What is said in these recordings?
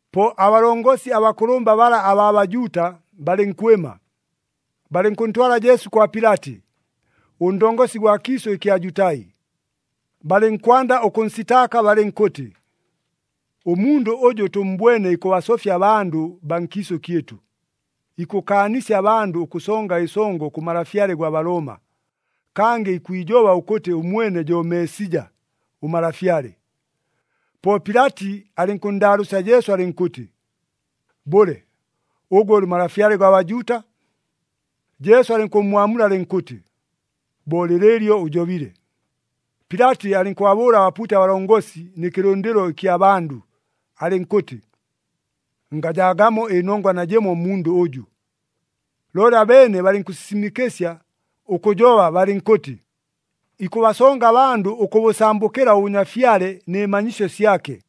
Po abalongosi abakʉlʉmba bala abaa Bajuuta, balɨnkwɨma, balɨnkʉntwala Jesu kwa Pilati, ʉndongosi gwa kiisʉ ɨkya Jutai. Balɨnkwanda ʉkʉnsitaaka balɨnkʉtɨ, “Ʉmundʉ ʉjʉ tʉmmbwene ikʉbasofya abandʉ baa nkiisʉ kyɨtʉ. Ikʉkaanisya abandʉ ʉkʉsonga ɨsongo kʉ malafyale gwa Balooma, kangɨ ikwijoba ʉkʉtɨ ʉmwene jo Meesija, ʉMalafyale.” Po Pilati alɨnkʉnndaalʉʉsya Jesu alɨnkʉtɨ, “Bʉle, ʉgwe ʉlɨ Malafyale gwa Bajuuta?” Jesu alɨnkʉmmwamula alɨnkʉtɨ, “Bo lɨlɨɨlyo ʉjobile.” Pilati alɨnkʉbabʉʉla abapuuti abalongosi nɨ kɨlʉndɨlo ɨkya bandʉ, alɨnkʉtɨ, “Ngajaagamo ɨnongwa najɨmo mmundʉ ʉjʉ.” Looli abeene balɨnkʉsisimɨkɨsya ʉkʉjoba balɨnkʉtɨ, “Ikʉbasonga abandʉ ʉkʉbʉsambʉkɨla ʉbʉnyafyale nɨ manyisyo syake,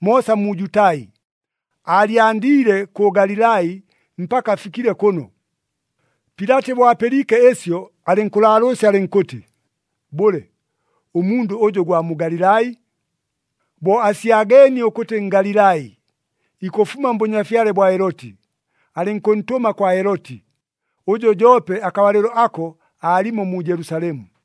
moosa mu Jutai. Aalyandiile kʉ Galilai mpaka afikile kʉno.” Pilati bo apɨliike ɨsyo, alɨnkʉlaalʉʉsya alɨnkʉtɨ, “Bʉle, ʉmundʉ ʉjʉ gwa mu Galilai?” Bo asyageenie ʉkʉtɨ Ngalilai, ikʉfuma mbʉnyafyale bwa Heloti, alɨnkʉntʉma kwa Heloti, ʉjʉ joope akabalɨlo ako aalimo mu Jelusalemu.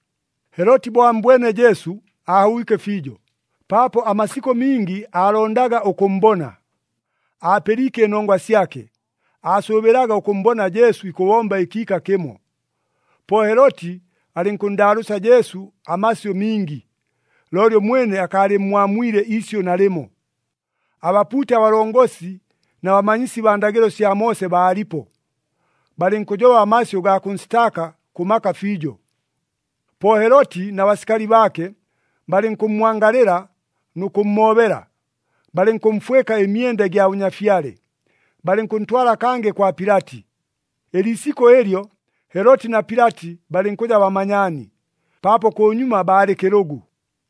Heloti bo ammbwene Jesu, aahobwike fiijo, paapo amasikʉ mingi aalondaga ʉkʉmmbona. Aapɨliike ɨnongwa syake, aasʉʉbɨlaga ʉkʉmmbona Jesu ikʉbomba ɨkiika kɨmo. Po Heloti alɨnkʉnndaalʉʉsya Jesu amasyʉ mingi, looli ʉmwene akaalɨmmwamwile iisyʉ nalɨmo. Abapuuti abalongosi na bamanyisi baa ndagɨlo sya Moose baalipo, balɨnkʉjoba amasyʉ gaa kʉnsitaaka kʉ maka fiijo. Po Heloti na basikali baake, balɨnkʉmmwangalɨla nʉ kʉmmoobela. Balɨnkʉmfwɨka ɨmyenda ɨgya bʉnyafyale, balɨnkʉntwala kangɨ kwa Pilati. Ɨliisikʉ ɨlyo, Heloti na Pilati balɨnkʉja bamanyaani, paapo kʉnyuma baalɨ kɨlʉgʉ.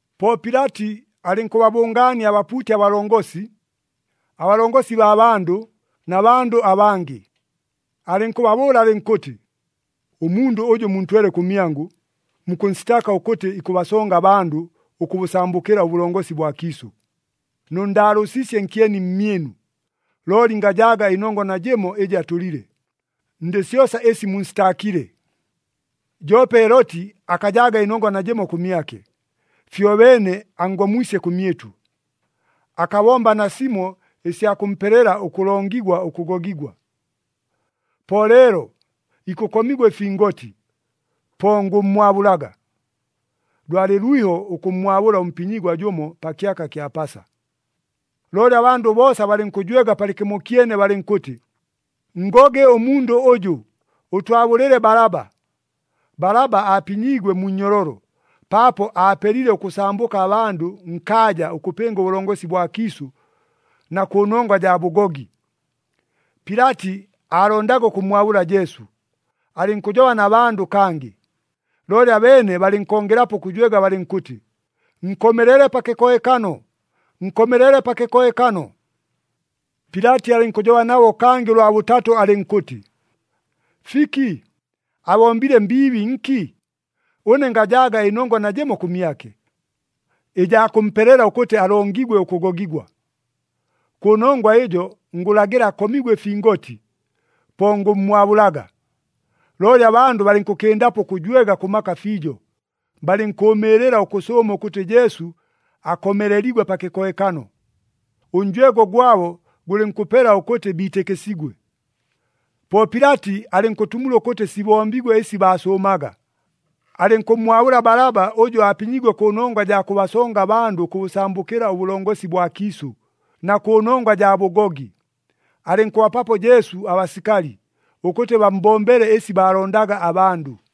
Po Pilati alɨnkʉbabʉngaania abapuuti abalongosi, abalongosi baa bandʉ na bandʉ abangɨ. Alɨnkʉbabʉʉla alɨnkʉtɨ, “Ʉmundʉ ʉjʉ muntwele kʉmyangʉ, mukʉnsitaaka ʉkʉtɨ ikʉbasonga abandʉ ʉkʉbʉsambʉkɨla ʉbʉlongosi bwa kiisʉ. Nʉnndaalʉʉsiisye nkyeni mmyɨnu, looli ngajaaga ɨnongwa najɨmo ɨjɨ atʉlile, ndɨ syosa ɨsi munsitaakile. Joope Heloti akajaaga ɨnongwa najɨmo kʉmyake, fyobeene anngomwisye kʉmyɨtʉ. Akabomba nasimo ɨsya kʉmpelela ʉkʉlongigwa ʉkʉgogigwa. Po leelo, ikʉkomigwa ɨfingoti, po ngʉmmwabʉlaga.” [ Lwalɨ lwiho ʉkʉmmwabʉla ʉmpinyigwa jʉmo pa kyaka kya Pasa.] Looli abandʉ boosa balɨnkʉjwega palɨkɨmokyene balɨnkʉtɨ, “Nngoge ʉmundʉ ʉjʉ! Ʉtwabʉlɨle Balaba!” Balaba aapinyiigwe mu nnyololo, paapo aapelile ʉkʉsambʉka abandʉ nkaaja ʉkʉpɨnga ʉbʉlongosi bwa kiisʉ, na kʉnongwa jaa bʉgogi. Pilati aalondaga ʉkʉmmwabʉla Jesu, alɨnkʉjoba na bandʉ kangɨ. Looli abeene balɨnkongelapo ʉkʉjwega balɨnkʉtɨ, “Nkomelele pa kɨkohekano! Nkomelele pa kɨkohekano!” Pilati alɨnkʉjoba nabo kangɨ ʉlwa bʉtatʉ alɨnkʉtɨ, “Fiki? Abombile mbiibi nki? Ʉne ngajaaga ɨnongwa najɨmo kʉmyake, ɨjaa kʉmpelela ʉkʉtɨ alongigwe ʉkʉgogigwa! Kʉnongwa ɨjo ngʉlagɨla akomigwe ɨfingoti, po ngʉmmwabʉlaga.” Looli abandʉ balɨnkʉkɨndapo ʉkʉjwega kʉ maka fiijo, balɨnkʉʉmɨɨlɨla ʉkʉsʉʉma ʉkʉtɨ Jesu akomeleligwe pa kɨkohekano. Ʉnjwego gwabo gʉlɨnkʉpela ʉkʉtɨ biitɨkɨsigwe. Po Pilati alɨnkʉtumula ʉkʉtɨ sibombigwe ɨsi baasʉʉmaga. Alɨnkʉmmwabʉla Balaba ʉjʉ aapinyiigwe kʉnongwa jaa kʉbasonga abandʉ ʉkʉbʉsambʉkɨla ʉbʉlongosi bwa kiisʉ, na kʉnongwa jaa bʉgogi, alɨnkʉbapapo Jesu abasikali, ʉkʉtɨ bammbombele ɨsi baalondaga abandʉ.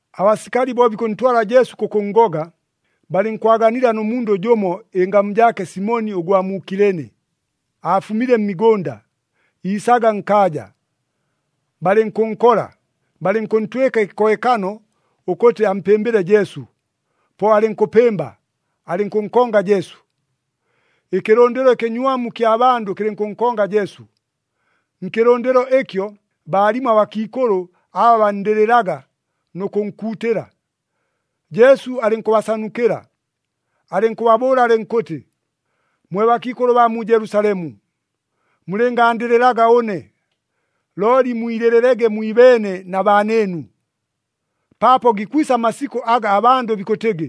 Abasikali bo bikʉntwala Jesu kʉkʉnngoga, balɨnkwaganila nʉ mundʉ jʉmo ɨngamu jaake Simoni ʉgwa mu Kilene, aafumile mmigʉnda, iisaga nkaaja. Balɨnkʉnkola, balɨnkʉntwɨka ɨkɨkohekano ʉkʉtɨ ampɨmbɨle Jesu. Po alɨnkʉpɨmba, alɨnkʉnkonga Jesu. Ɨkɨlʉndɨlo ɨkɨnywamu kya bandʉ kɨlɨnkʉnkonga Jesu. Nkɨlʉndɨlo ɨkyo, baalimo abakiikʉlʉ aba banndɨlɨlaga nʉ kʉnkuutɨla. Jesu alɨnkʉbasanukɨla, alɨnkʉbabʉʉla alɨnkʉtɨ, “Mwe bakiikʉlʉ baa mu Jelusalemu! Mulɨngaandɨlɨlaga ʉne, looli mwilɨlɨlege mwibeene na baanɨɨnu! Paapo gikwisa amasikʉ aga abandʉ bikʉtɨgɨ,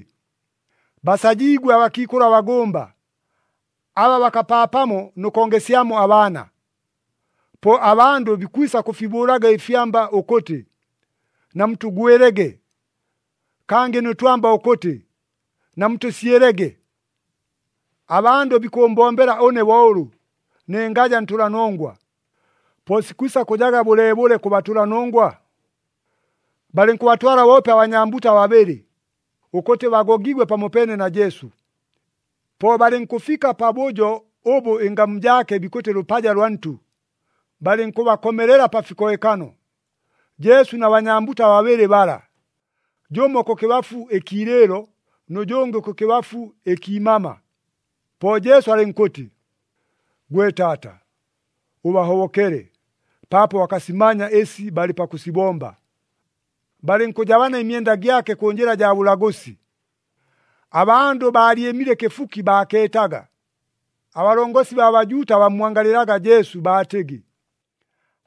‘Basajiigwe abakiikʉlʉ abagʉmba, aba bakapaapamo nʉ kongesyamo abaana!’ Po, ‘Abandʉ bikwisa kʉfibʉʉlaga ɨfyamba ʉkʉtɨ, “Namutʉgwɨlege!” Kangɨ nʉ twamba ʉkʉtɨ, “Namutʉsyɨlege!” ’ “Abandʉ bikʉʉmbombela ʉne bo ʉlʉ, ne ngaja ntʉlanongwa. Po sikwisa kʉjaga bʉleebʉle kʉ batʉlanongwa?” Balɨnkʉbatwala boope abanyambuta babɨlɨ, ʉkʉtɨ bagogiigwe pamopeene na Jesu. Po balɨnkʉfika pabʉjo ʉbʉ ɨngamu jaake bikʉtɨ Lʉpaja lwa Ntʉ, balɨnkʉbakomelela pa fikohekano, Jesu na banyambuta babɨlɨ bala, jʉmo kʉkɨbafu ɨkiilɨɨlo, nʉ jʉngɨ kʉkɨbafu ɨkiimama. Po Jesu alɨnkʉtɨ, “Gwe Taata, ʉbahobokele, paapo bakasimanya ɨsi balɨ pakʉsibomba.” Balɨnkʉjabana ɨmyenda gyake kʉ njɨla jaa bʉlagʉsi. Abandʉ baalyɨmile kɨfuki baakeetaga. Abalongosi baa Bajuuta bammwangalɨlaga Jesu, baatɨgɨ,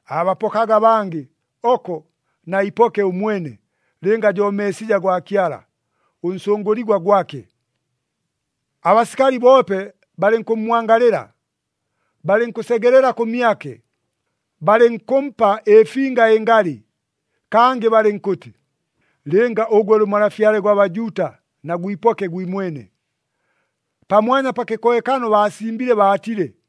“Aabapokaga abangɨ, oko na iipoke ʉmwene, lɨnga jo Meesija gwa Kyala, ʉnsʉngʉligwa gwake!” Abasikali boope balɨnkʉmmwangalɨla, balɨnkʉsegelela kʉmyake, balɨnkʉmpa ɨfinga ɨngalɨ, kangɨ balɨnkʉtɨ, “Lɨnga ʉgwe ʉlɨ Malafyale gwa Bajuuta, na gwipoke gwimwene!” Pamwanya pa kɨkohekano baasimbile baatile,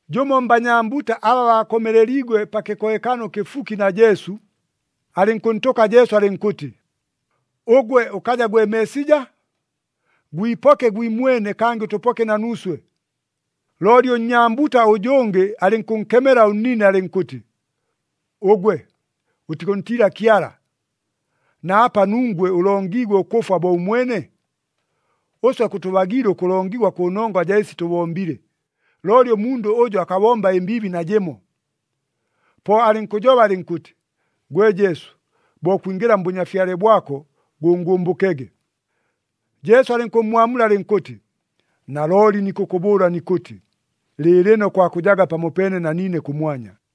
Jʉmo mbanyambuta aba baakomeleliigwe pa kɨkohekano kɨfuki na Jesu, alɨnkʉntʉka Jesu alɨnkʉtɨ, “Ʉgwe ʉkaja gwe Meesija? Gwipoke gwimwene kangɨ ʉtʉpoke na nuuswe!” Looli ʉnnyambuta ʉjʉngɨ alɨnkʉnkemela ʉnnine alɨnkʉtɨ, “Ʉgwe ʉtikʉntiila Kyala, na apa nungwe ʉlongiigwe ʉkʉfwa bo ʉmwene? Ʉswe kʉtʉbagiile ʉkʉlongigwa kʉnongwa jaa ɨsi tʉbombile, looli ʉmundʉ ʉjʉ akabomba ɨmbiibi najɨmo.” Po alɨnkʉjoba alɨnkʉtɨ, “Gwe Jesu! Bo kwingɨla mBʉnyafyale bwako gʉngʉmbʉkege!” Jesu alɨnkʉmmwamula alɨnkʉtɨ, “Nalooli nikʉkʉbʉʉla nikʉtɨ, lɨɨlɨno kwakʉjaga pamopeene na niine kʉmwanya.”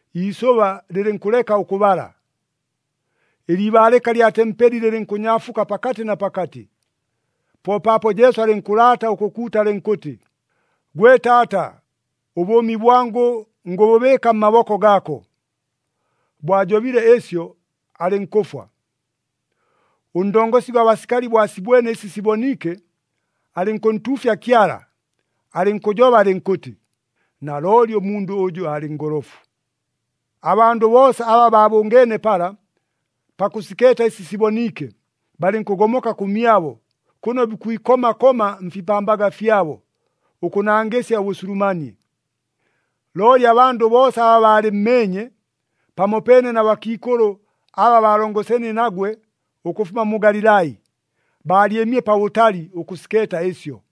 iisʉba lɨlɨnkʉleka ʉkʉbala. Ɨliibaalɨka lya tempeli lɨlɨnkʉnyaafuka pakatɨ na pakatɨ. Po paapo Jesu alɨnkʉlaata ʉkʉkuuta alɨnkʉtɨ, “Gwe Taata! Ʉbʉʉmi bwangʉ ngʉbʉbɨɨka mmaboko gaako.” Bo ajobile ɨsyo, alɨnkʉfwa. Ʉndongosi gwa basikali bo asibwene ɨsi siboniike, alɨnkʉntuufya Kyala, alɨnkʉjoba alɨnkʉtɨ, “Nalooli ʉmundʉ ʉjʉ aalɨ ngolofu!” Abandʉ boosa aba baabʉngeene pala, pakʉsikeeta ɨsi siboniike, balɨnkʉgomoka kʉmyabo, kʉno bikwikoma koma mfipambaga fyabo, ʉkʉnangɨsya ʉbʉsulumanie. Looli abandʉ boosa aba baalɨmmeenye, pamopeene na bakiikʉlʉ aba baalongoseenie nagwe ʉkʉfuma mu Galilai, baalyɨmile pabʉtali ʉkʉsikeeta ɨsyo.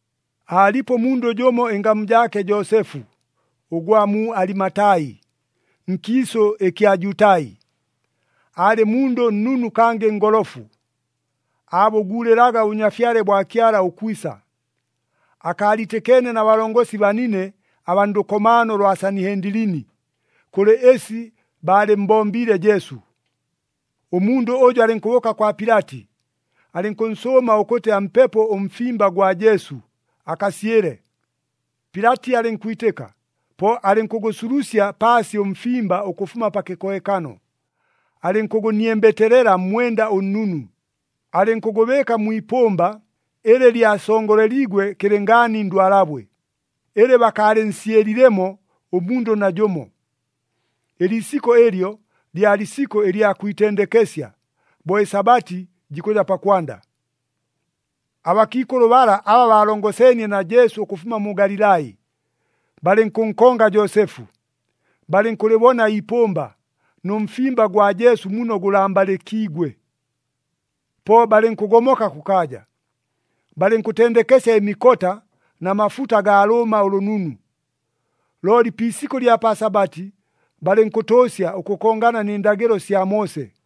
Aalipo ʉmundʉ jʉmo ɨngamu jaake Joosefu, ʉgwa mu Alimatai, nkiisʉ ɨkya Jutai. Aalɨ mundʉ nnunu kangɨ ngolofu, aabʉguulɨlaga ʉBʉnyafyale bwa Kyala ʉkwisa. Akaaliitɨkeene na balongosi banine abaa ndʉkomaano lwa Sanihendilini, kʉlɨ ɨsi baalɨmmbombiile Jesu. Ʉmundʉ ʉjʉ alɨnkʉbʉʉka kwa Pilati, alɨnkʉnsʉʉma ʉkʉtɨ ampepo ʉmfimba gwa Jesu, akasyɨle. Pilati alɨnkwitɨka, po alɨnkʉgʉsulusya paasi ʉmfimba ʉkʉfuma pa kɨkohekano. Alɨnkʉgʉniembeteelela mmwenda ʉnnunu, alɨnkʉgʉbɨɨka mwi ipʉmba ɨlɨ lyasongoleliigwe kɨlɨngaani ndwalabwe, ɨlɨ bakaalɨnsyɨlilemo ʉmundʉ najʉmo. Ɨliisikʉ ɨlyo, lyalɨ isikʉ ɨlya kwitendekesya, bo ɨSabati jikʉja pakwanda. Abakiikʉlʉ bala aba baalongoseenie na Jesu ʉkʉfuma mu Galilai, balɨnkʉnkonga Joosefu, balɨnkʉlɨbona iipʉmba, nʉ mfimba gwa Jesu muno gʉlambalɨkiigwe. Po balɨnkʉgomoka kʉkaaja, balɨnkʉtendekesya ɨmikota na mafuta gaa lʉʉma ʉlʉnunu. Looli pi isikʉ ɨlya pa Sabati, balɨnkʉtʉʉsya ʉkʉkongana nɨ ndagɨlo sya Moose.